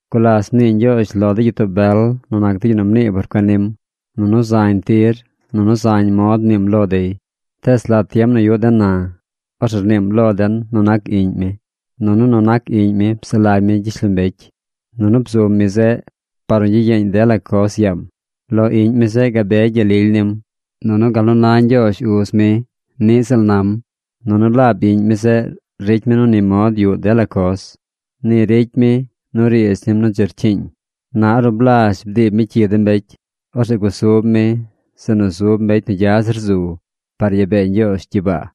Gulas mnii Ñgyoozh lo de gyitoo bel nu nac de yu nu mnii por cuen nim. Nunu zañ tir, nunu zañ mod mniim lo dey. Tees lat tiem nu yuꞌ den na, orzeꞌ rniim lo den nu nac Iꞌñ mi. Nunu nu nac Iꞌñ mi psaꞌ lagy mi gyishlombecy. Nunu bzum mi zeꞌ par nu gyiyeeñ dela coz yaam. Lo Iꞌñ mi zeꞌ gabe gyel lily nim, nunu gal nu na Ñgyoozh Uz mi niꞌ ziꞌl nam. Nunu laab Iꞌñ mi zeꞌ ricy mi nu ni mod yuꞌ dela coz. Ni ricy mi nu riidz nim nu dzi rcyiiñ. Na ornu blazh bdiib mi cyi de mbecy, orzeꞌ gusub mi zeꞌ nu zub mbecy nu gya zir zu par yaa bee Ñgyoozh gyibaa.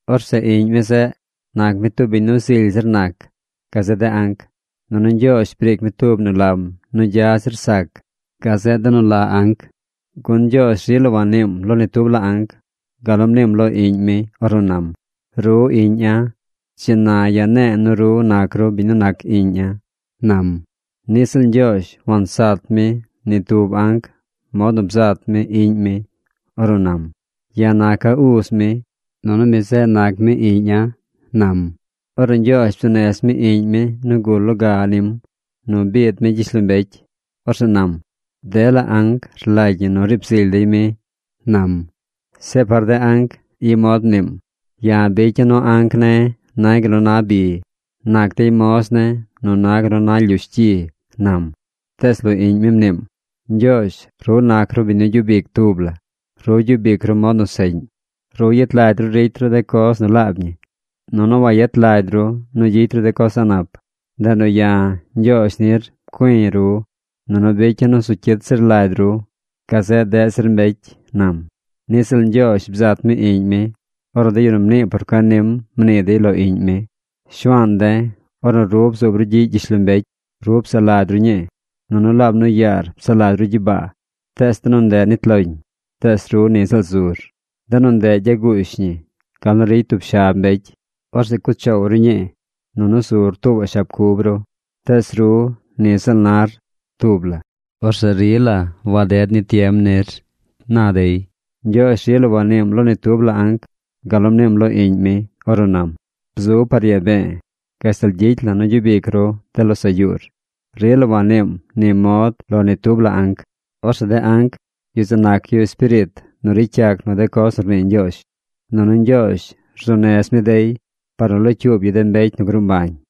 Orzeꞌ Iꞌñ mi zeꞌ nac mi tub biñ nu zily zir nac gazeꞌ de anc, nunu Ñgyoozh briic mi tub nu lam nu gya zir sac gazeꞌ de nu la anc. Gun Ñgyoozh rila wanniim lo ni tub la anc gal nu mniim lo Iꞌñ mi ornu nam: Ru Iꞌña̱. Dzi na ya̱ ne̱e̱ nu ru nac ru biñ nu nac Iꞌña̱, nam. Niꞌ ziꞌl Ñgyoozh wansat mi ni tub anc mod nu bzat mi Iꞌñ mi ornu nam: Ya̱ naca̱ Uz mi, nunu mi zeꞌ nac mi Iꞌña̱, nam. Ornu Ñgyoozh bzuu nez mi Iꞌñ mi nu gul loga nim nu biid mi gyishlombecy, orzeꞌ nam: Dela anc rlagy ñi nu riib zily dey mi, nam. Zeꞌ par de anc, i mod mniim: Ya̱ bicya̱ nu anc ne̱ nay gal nu na bi. Nac dey moz ne̱ nu na gal nu na lyush gyi, nam. Tees lo Iꞌñ mi mniim: Ñgyoozh, ru nac ru biñ nu gyub ic tub la. Ru gyub ic ru mod nu seꞌñ. Ru yet lagy ru nu ricy ru de coz nu laab ñi, nunu wayet lagy ru nu gyicy ru de coz a̱ꞌ nap. Ndeꞌ nu ya̱, Ñgyoozh nir, pcui̱ ru, nunu bicya̱ nu zu cyit zir lagy ru gazeꞌ deꞌ zir mbecy, nam. Niꞌ ziꞌl Ñgyoozh bzat mi Iꞌñ mi ornu de yu nu mnii por cuen nim mnii dey lo Iꞌñ mi: Shuaan de̱, ornu ru bzuub ru gyiꞌ gyishlombecy, ru psaꞌ lagy ru ñii. Nunu laab nu yaar psaꞌ lagy ru gyibaa. Tees de nu ndeꞌ nit loñ, tees ru ni ziꞌl zur. De nu ndeꞌ gyaguush ñi gal nu ricy tub shab mbecy. Orzeꞌ cuꞌ choow ru ñii, nunu zur tuubaꞌ shab cub ru. Tees ru ni ziꞌl nar tub la. Orzeꞌ rila waded ni tiem nir, na dey. Ñgyoozh rila wanniim lo ni tub la anc gal nu mniim lo Iꞌñ mi ornu nam: Bzub par yaa be̱e̱ gashtal gyicy la̱ nu gyub ic ru de losaꞌ yuur. Rila wanniim ni mod lo ni tub la anc. Orzeꞌ de anc, yu zeꞌ nac yu espiriit nu ricy yac nu de coz nu rnii Ñgyoozh. Nunu Ñgyoozh rzuu nez mi dey par nu locyuub yu de mbecy nu gruu mbañ.